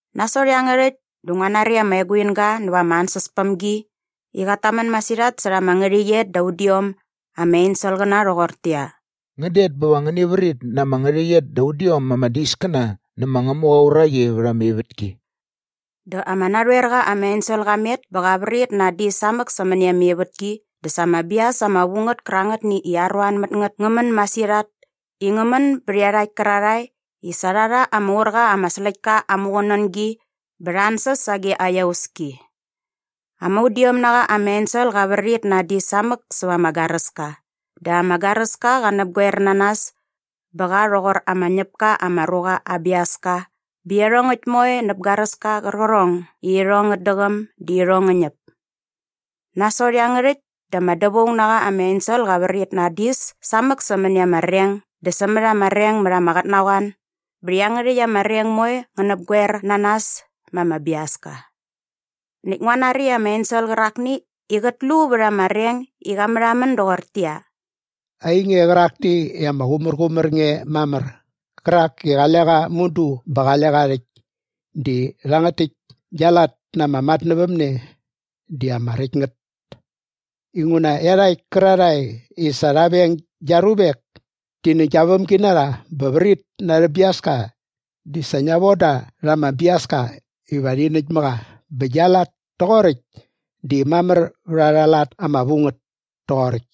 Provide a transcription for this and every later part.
Nasot iangärhäkt dä ngua nari ama eguinga näva ama ansäspämgi i qat tamän masirhat särha ama ngärhäqyet da udiom ama enselqäna rhoqortäqyia, “Ngän det bä va ngäni vrit na ama ngärhäqyet da udiom ama diskäna nä ma Ngämuqa aa uraqi vät ama ivätki.” Dä ama narhoer qa ama ensel qa met bä qa vrit na aa dis samäk sämäni ama ivätki dä sa ama bias ama vu ngät kärangätni i aruan mät ngät ngä män masirhat i ngä män bät iarhakt kärarhae i sa rha rha ama ur qa ama släktka aa muqunängi bä rha ansäs sage aa iauski. Ama udiom na qa ama ensel qa vrit na aa dis samäk säva ama garäska dä ama garäska qa näpqoer na nas bä qa rhoqor ama ñäp ka ama ruqa aa biaska bä iarhongäkt moe näp garäska qärqärhong i irhong ngät däqäm di irhong ngä ñäp. Nasot iangärhäkt dä ama dävaung na qa ama ensel qa vrit na aa dis samäk sämäni ama reng dä sämät ama reng mät ama qotnaqoan bä iangärhäkt ama reng moe ngä näpgoer na nas ma ama biaska. Näkt ngua nari ama ensel qärakni i qät lu vät ama reng i qa märhamän doqortäqyia, “Ainge qärakni i ama qumärqumär nge mamär qärak i qale qa mudu bä qale qa rhäkt di rhangät täkt gia lat na ama matnävämne di ama räkt ngät inguna iarhakt kärarhae i sa rha veng gia ruvek ti nä gia vämginarha bä vrit na arhä biaska di sa ngia von da rha ama biaska iva rhi näkt mä qa bä gia lat toqoräkt di mamär vät arha lat ama vu ngät toqoräkt.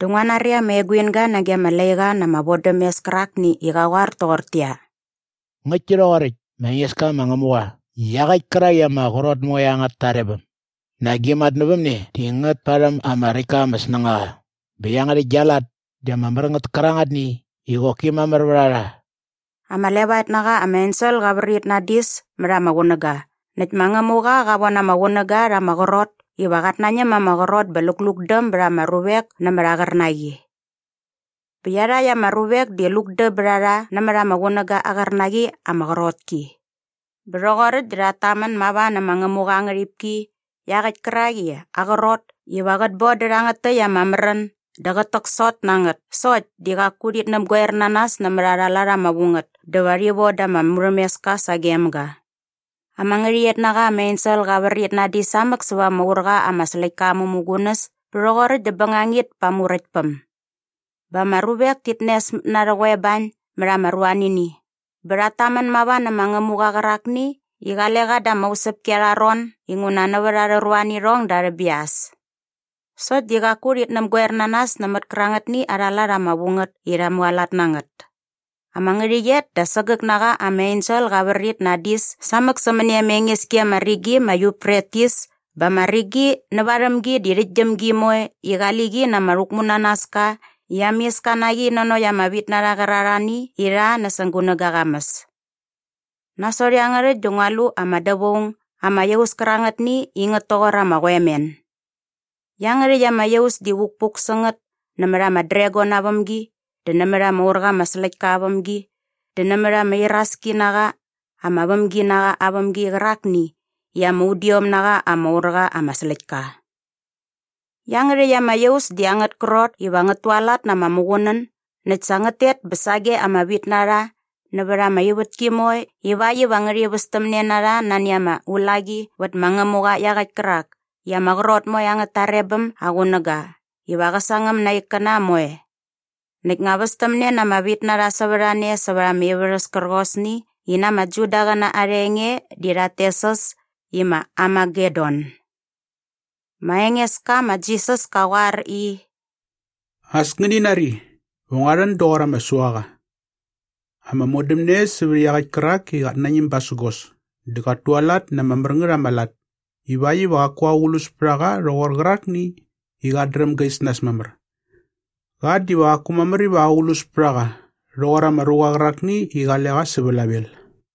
Dä ngua nari ama eguinga nage ama laiqa na ama vodämes kärakni i qa qoar toqortäqyia, “Ngäktki rhoqoräkt, ma Engeska ma Ngämuqa iaqäkt kärak i ama qrot moe angät tarebäm. Nak gia matnävämne di ngät parhäm ama räkt ka ama snängaqa bä iangärhäkt gia lat di ama mär ngät kärangätni i qoki mamär vät a rha!” Ama levaet na qa ama ensel qa vrit na aa dis mät ama qunäga näkt ma Ngämuqa qa von ama qunäga rha ama qrot iva qat nañäm ma ama qrot bä luqulukdäm bät ama ruvek nämät aa qärnaqi. Bä iarhakt ama ruvek di lukdäm bät a rha nämät ama qunäga aa qärnaqi ama qrot ki. Bä rhoqoräkt dä rhat tamän mava nä ma Ngämuqa aa ngärhipki iaqäkt kärak i aa qrot iva qät bon dä rhangät täkt ama märän dä qät täksot na ngät sokt di qaku rhit näpgoer na nas nämät arha lat ama vu ngät dä va rhi von da ama murhämeska sagem ga. Ama ngärhäqyet na qa ama ensel qa vrit na aa dis samäk säva ama ur qa ama släktka aa mämugunäs bä rhoqoräkt dä bängangit pa aa muräktpäm. Bä ama ruvek tit nesmät na arhä qoebañ mät ama ruanini bä rhat tamän mava nä ma Ngämuqa qärakni i qale qa da ama usäpki arha ron inguna nävät arhä ruanirhong dä arhä bias. Sokt di qaku rhit näpgoer na nas nämät kärangätni arha lat ama vu ngät i rha mualat na ngät. Ama ngärhäqyet da sägäk na qa ama ensel qa vrit na aa dis samäk sämäni ama enges ki ama rigi ma Yufretis bä ama rigi nä värhäm gi di rhäktgyäm gi moe i qali qi na ama rhäkmunanaska i ama iska na qi nanokt ama vitnarha kärarhani i rha näsäng gunäga aa qamäs. Nasot iangärhäkt dä ngua lu ama dävaung ama iaus kärangätni i ngät toqor ama qoemen. Iangärhäkt ama iaus di vukpuk sä ngät nämät ama dragon aa vämgi dä nämät ama ur qa ama släktka aa vämgi dä nämät ama iraski na qa ama vämginaqa aa vämgi qärakni i ama udiom na qa ama ur qa ama släktka. Iangärhäkt ama iaus di angät krot iva ngät tualat na ama muqunän näkt sa ngät tet bä sage ama vitnarha nävät ama ivätki moe ivakt iva ngärhi västämne na rha nani ama ulaqi vät ma Ngämuqa iaqäkt kärak i ama qrot moe angät tarebäm aa qunäga iva qä sangäm na aa ikkäna moe. Näkt ngä västämne na ama vitnarha sävät a ne säva ama ivärhäs kärqosni i na ama Judaqäna arha enge di rhat tes äs i ma Armagedon. Ma Engeska ma Jisas ka qoar i, “As ngäni nari, va ngua rhän doqor ama suaqa. Ama modämne sävät iaqäkt kärak i qat nañäm basägos dä qat tualat na ama mär ngät ama lat ivakt iva qaku aqlus pät a qa rhoqor qärakni i qät dräm ga is nas mamär. Qa diva qaku mamär iva aqlus pät a qa rhoqor ama ruqa qärakni i qale qa sä vlavel.”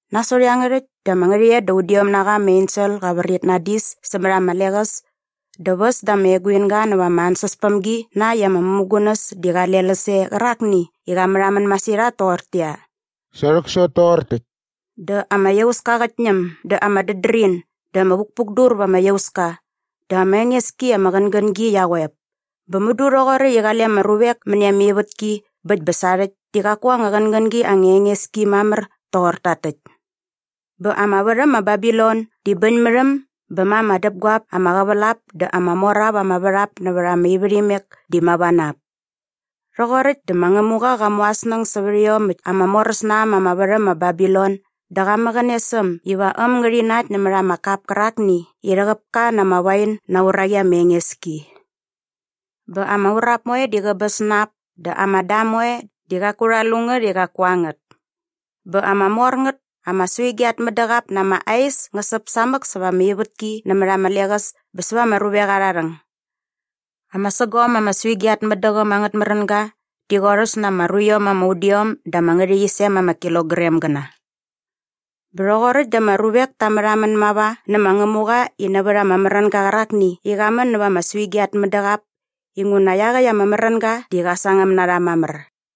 Nasot iangärhäkt dä ama ngärhäqyet da udiom na qa ama ensel qa vrit na aa dis sämät ama leqäs dä väs da ama eguinga näva ama ansäspämgi na äkt i ama mämugunäs di qale läs e qärakni i qa märhamän masirhat toqortäqyia, “Sa rhäksot toqor täkt!” Dä ama iauska qät ñäm dä ama dädrin dä vukpukdur va ama iauska dä ama enges ki ama qängängi qia qoep. Bä mudu rhoqoräkt i qale ama ruvek mäni ama ivätki bä äkt bä sarhäkt dä qaku anga qängängi anga enges ki mamär toqor takt täkt. Bä ama värhäm ma Babilon di bäñ mät äm bä ma ama däpguap ama qävälap dä ama mor ap ama värhap nävät ama ivärhimek di mava na ap. Rhoqoräkt dä ma Ngämuqa qa mu aa snäng sävät iomäkt ama moräs na äm ama värhäm ma Babilon dä qa mäqäne sä äm iva äm ngärhi nakt nämät ama kap kärakni i rhäqäp ka na ama wain na aa uraqi ama enges ki. Bä ama urap moe di qäbäs na ap dä ama dam moe di qaku rha lu ngät i qaku a ngät. Bä ama mor ngät ama suigi at mädäqap na ama ais ngä säp samäk sävät ama ivätki nämät ama leqäs bä säva ama ruvek arha rhäng. Ama sägom ama suigi at mädäqäm angät märänga di qorhäs na ama ruiom ama udiom da ama ngärhäqyisem ama kilogramgäna. Bä rhoqoräkt dä ama ruvek ta märhamän mava nä ma Ngämuqa di nävät ama märänga qärakni i qa män nävät ama suigi at mädäqap inguna iaqäkt ama märänga di qa sangäm na rha mamär.